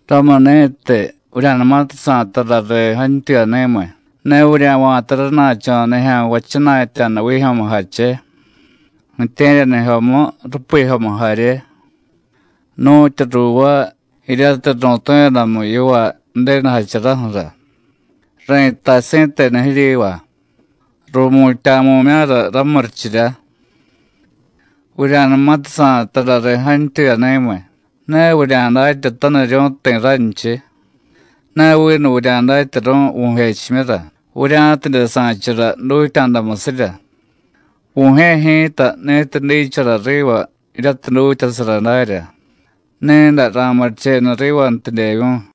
Ramuni̱tiy, vurya̱numatiy sa̱y tara riy jantyuyani̱miy, ne vurya̱va̱ta rana̱cho̱ nijya̱nvay jchana̱tya̱da vijyo̱mujache, ju̱tye̱ryanijyomu, rupijyomu jarye, nu̱tyu ruuvaay jiryatiy ru̱tu̱yadamu yivaay Ju̱denu jacharaju̱ra. Ri̱tay si̱tenu jiryiva: Ru̱mutya̱mu̱mya̱ra ramurichirya. Vurya̱numatiy sa̱y tarariy jantyuyani̱miy, ne vurya̱datyataniryu̱y ti̱ ranchiy, ne vinu vurya̱datyaru̱y vu̱jechimyura, vurya̱tidye sa̱chara dutya̱damusirya. Vu̱jye̱ ji̱ta ni̱tiy dichara riva jiryatiy dutyasara darya, ni̱day ra̱murichenu rivantidyevyu̱y.”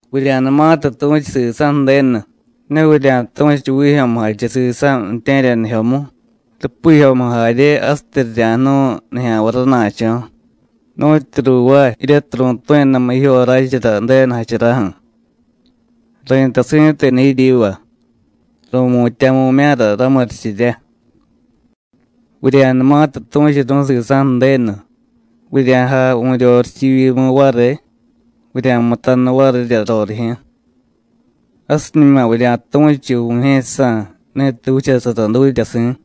“Vurya̱numatiy tu̱chu sisa̱ Ju̱denu, ne vurya̱tu̱chu vijyo̱mujache sisa̱ ju̱tye̱ryanijyomu, rupijyomu jarye, jasityi rirya̱jnu̱y nijya̱nvay rana̱cho̱, nu̱tyu ruuvaay jiryatiy ru̱tu̱yadamu jijyoráchara Ju̱denu jacharaju̱. Ri̱tay si̱tenu jiryiva: Ru̱mutya̱mu̱mya̱ra ramurichirya. Vurya̱numatiy tu̱churu̱y sisa̱ Ju̱denu, vurya̱jay vu̱ryorichivyimu variy, vurya̱mutanu varirya rorijyu̱. Jasiñuma vurya̱tu̱chu Vu̱jye̱jsa̱, ni̱tiy vichasara dutyasi̱.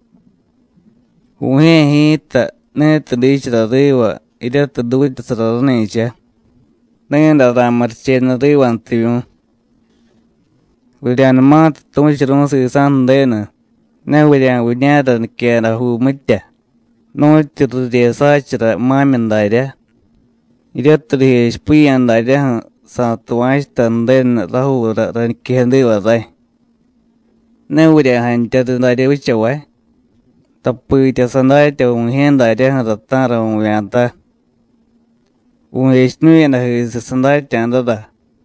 Vu̱jye̱ ji̱ta, ni̱tiy dichara riva jiryatiy dutyasara rani̱cha, ni̱day ra̱murichenu rivantivyu̱y. Vurya̱numatiy tu̱churu̱y sisa̱ Ju̱denu, ne vurya̱viña̱ra niquejadajuu mitya, nu̱tyu riryesááchara ma̱myi daryá, jiryatiy rijechipiya̱ daryaju̱: Sa̱tuva̱chuta Ju̱denu rajuura rañiquejadiva ray. Ne vurya̱jantyariy darya vichavay, tapitya sadatya Vu̱jye̱ daryaju̱ra ta̱ra vu̱vya̱ta. Vu̱jechiñu̱yadajisiy sadatya̱dara.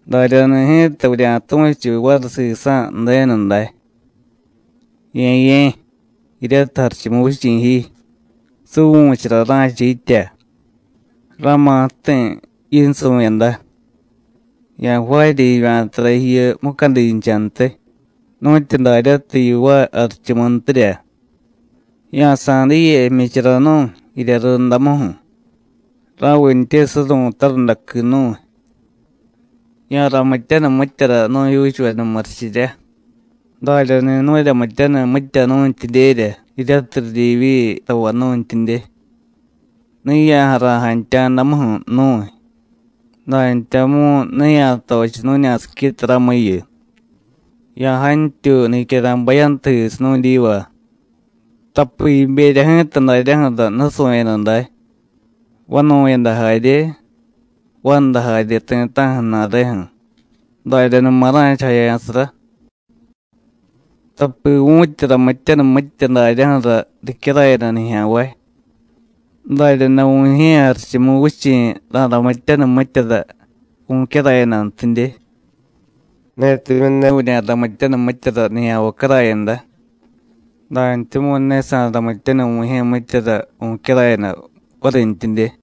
Daryani̱ ji̱ta vurya̱tu̱chu variy sisa̱ Ju̱denu day: Ye̱ye̱, jiryatiy Jarichumuvichi̱ ji, suvu̱chara ra̱cha yitya. Ra̱ma̱ ju̱ti̱ yinsu̱yada; ya̱jvaarya jivya̱tara jiyu mucadinchantiy, nu̱tyu daryatiy yivaay jarichumuntirya. Ya̱sa̱y diye jmyichara nu̱y, jirya rundamuju̱, ra̱vintye suru̱y tarundaqui nu̱y. Ya̱ramityaniy mityara nu̱jyuuchuveda murichirya, daryani̱ nu̱ryamityaniy mitya nu̱ntyidyerya jiryatiy ridyivyi tavay nu̱ntyidye. Ne ya̱jara̱y jantya̱damuju̱ nu̱y, dantyamu̱y ne ya̱tochiy nu̱ña̱siquita ramuyu. Ya̱jantyuy nicyara̱y bayantujisiy nu̱dyiva. (Tapi jiberya ji̱ta daryaju̱ra nusu̱yada day, vanu̱yada jarye, vanda jarye ti̱ta̱ju̱ ju̱na̱reju̱. Daryanuma ra̱chajaya̱sara.) Tapi vu̱tyi ramityaniy mitya daryaju̱ra ricyarayada nijya̱nvay, daryaday Vu̱jye̱ Jarichumuvichi̱ ra̱ramityaniy mityara vu̱cyarayadantidye. Netimyu̱ ne vurya̱ramityaniy mityara nijya̱nvay carayada, dantyamu̱y ne sa̱ramityaniy Vu̱jye̱ mityara vu̱cyarayada varintyidye.”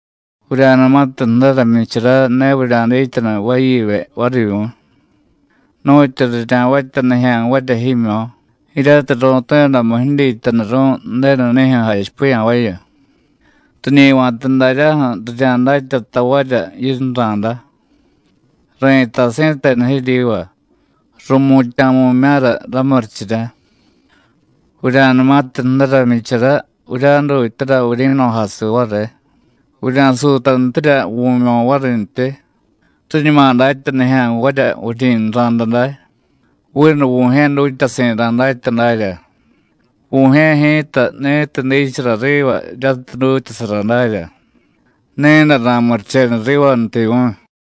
“Vurya̱numatiy jdara jmyichara, ne vurya̱dityanu vayivye varivyu̱y, nu̱tyu rirya̱vatya nijya̱nvarya jimyo̱ jiryatiy ru̱tu̱yadamu jidyityanuru̱y Ju̱denunijyu̱ jachipiya̱vayu. Riñi va̱ta daryaju̱ rirya̱datya tavarya yinra̱da. Ri̱tay si̱tenu jiryiva: Ru̱mutya̱mu̱mya̱ra ramurichirya. Vurya̱numatiy jdara jmyichara, vurya̱jdutyara vuryi̱no̱jasiy variy, vurya̱suutantirya vu̱myo̱ varintyi, riñuma datya nijya̱nvarya vuryi̱nra̱da day, vinu Vu̱jye̱ dutyasi̱ ra̱datya darya. Vu̱jye̱ ji̱ta ni̱tiy dichara riva jiryatiy dutyasara darya, ni̱day ra̱murichenu rivantivyu̱y.”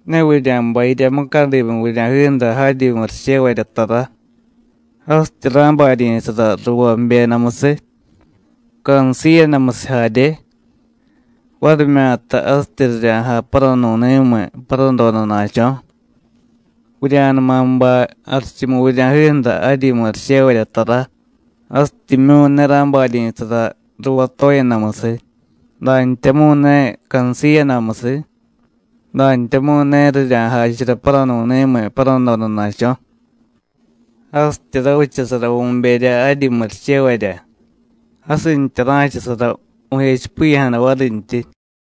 “Ne vurya̱bay jirya mucadimu vurya̱jiju̱ra jaryi murichevarya tara, jasityi ra̱baryi̱sara ruvá jbyedamusiy, cansiiyadamusiy jarye, varimyata jasityi rirya̱jay paranu̱ni̱miy paradodana̱cho̱. Vurya̱numa bay jarichumu vurya̱jiju̱ra jaryi murichevarya tara, jasityimyu̱ ne ra̱baryi̱sara ruvá toyedamusiy, dantyamu̱y ne cansiiyadamusiy, dantyamu̱y ne rirya̱jachara paranu̱ni̱miy paradodana̱cho̱. Jasityi ravichasara vu̱berya jaryi murichevarya, jasintya ra̱chasara vu̱jechipiya̱jada varintyi.”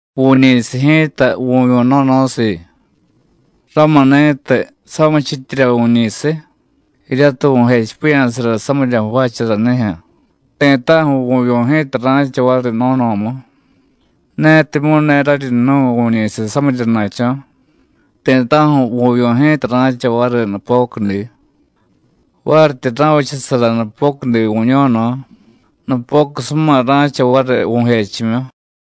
“Vu̱ñi̱siy ji̱ta vu̱vyu̱ no̱no̱siiy. Ramuni̱tiy, samichityirya vu̱ñi̱siy, jiryatiy vu̱jechipiya̱sara samirya jvaacharanijyu̱, ti̱ta̱ju̱ vu̱vyu̱ ji̱ta ra̱cha variy no̱no̱mu. Netimyu̱ ne raryi jnu̱y vu̱ñi̱siy samiryana̱cho̱, ti̱ta̱ju̱ vu̱vyu̱ ji̱ta ra̱cha variy nupocudi. Varityi ra̱vichasara nupocudi vu̱ño̱no̱, nupocusuma ra̱cha variy vu̱jechimyu.”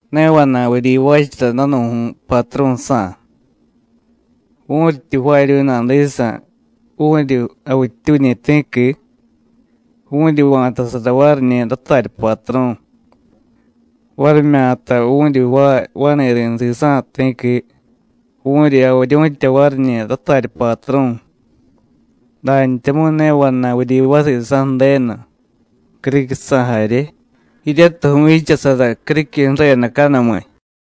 “Ne vana̱y vuryivaachara danu̱ju̱y patru̱sa̱. Vu̱ryityi jvaaryu̱y nadisa̱, vu̱ryi javittyuñi̱ ti̱qui, vu̱ryi va̱tasara variñi̱ ratarya patru̱, varimyata vu̱ryi jvaay vani̱ri̱ sisa̱ ti̱qui, vu̱ryi javiryu̱tya variñi̱ ratarya patru̱. Dantyamu̱y ne vana̱y vuryivaay sisa̱ Ju̱denu, criquisa̱ jarye, jiryatiy vu̱vyichasara criquiy ju̱redacanumiy.”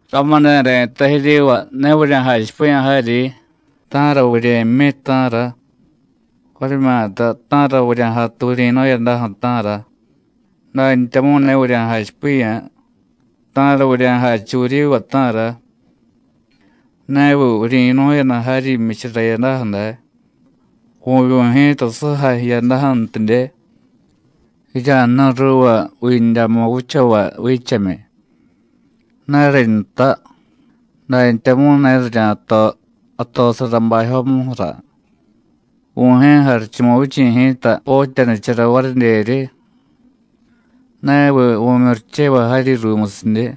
“Ramuni̱ ri̱tay jiryiva: Ne vurya̱jachipiya̱ jaryi: ¿Ta̱ra vurye̱jmyi, ta̱ra? varimyata: ¿Ta̱ra vurya̱jatu vuryi̱nu̱yadaju̱, ta̱ra? dantyamu̱y ne vurya̱jachipiya̱: ¿Ta̱ra vurya̱jachu vuryiva, ta̱ra? ¿Neviy vuryi̱nu̱yada jaryi jmyichara jiyadaju̱ day, vu̱vyu̱ ji̱ta sujay jiyadaju̱ntidye? Jirya̱jnu̱y ruuva vindyamu vichavay viichemyi. Ne rinta, dantyamu̱y ne rirya̱to jatosara bajyomuju̱ra, Vu̱jye̱ Jarichumuvichi̱ ji̱ta potyanichara varidyeryi. ¿Neviy vu̱myurichevay jaryi ruumusidye?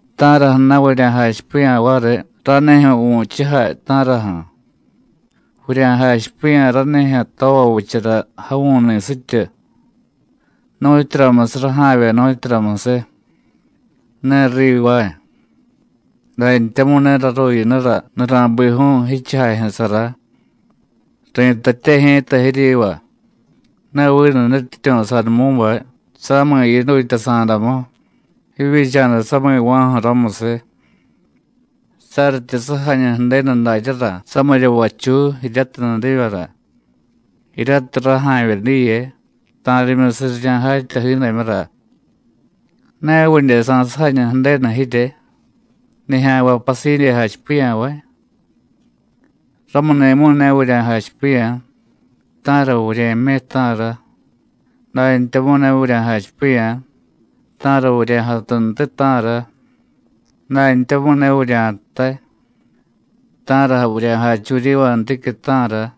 ¿Ta̱raju̱na̱ vurya̱jachipiya̱ variy ranijyu̱ vu̱chujay, ta̱raju̱? Vurya̱jachipiya̱ ranijyu̱ tova vichara javu̱ñi̱sityu, nu̱tyuramusiy raja̱vye, nu̱tyuramusiy. Ne rivaay, dantyamu̱y ne raruyinura nura̱biju̱u̱ jichujajyu̱sara. Ri̱tatye ji̱ta jiryiva: Ne vinu nutyityu̱ Sadumú̱bay samiy yidutyasa̱damu jivyicha̱da sami̱va̱ju̱ ramusiy. Saryityi sujañu Ju̱denu daryara samirya vachuy jiryatiy nudivyara, jiryatiy raja̱vye diye, ta̱rimyusiy rirya̱jatya jiidamyura, ¿ne vidye sa̱sujañu Ju̱denu jirye, nijya̱nvay pasidye jachipiya̱vay? Ramuni̱mu̱y ne vurya̱jachipiya̱: ¿Ta̱ra vurye̱jmyi, ta̱ra? dantyamu̱y ne vurya̱jachipiya̱: ¿Ta̱ra vurya̱jatuntiy, ta̱ra? dantyamu̱y ne vurya̱jtay: ¿Ta̱ra vurya̱jachu vuryivanticyu̱, ta̱ra?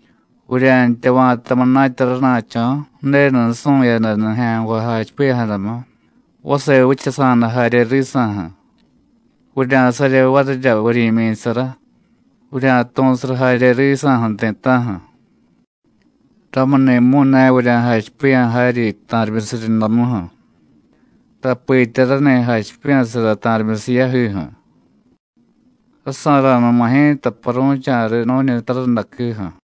Vurya̱ntya va̱ta munatya rana̱cho̱ Ju̱denu nusu̱yada nijya̱nvay jachipiya̱jadamu, vase vichasa̱da jarye risa̱ju̱, vurya̱sarye varirya vuryi̱myi̱sara, vurya̱tu̱sara jarye risa̱ju̱ ti̱ta̱ju̱. Ramuni̱mu̱y ne vurya̱jachipiya̱ jaryi ta̱rimyusiy rundamuju̱, tapitya rani jachipiya̱sara ta̱rimyusiy yajiju̱. Rasa̱ra̱numa ji̱ta paru̱cha̱riy nu̱ñi tarundaquiju̱.”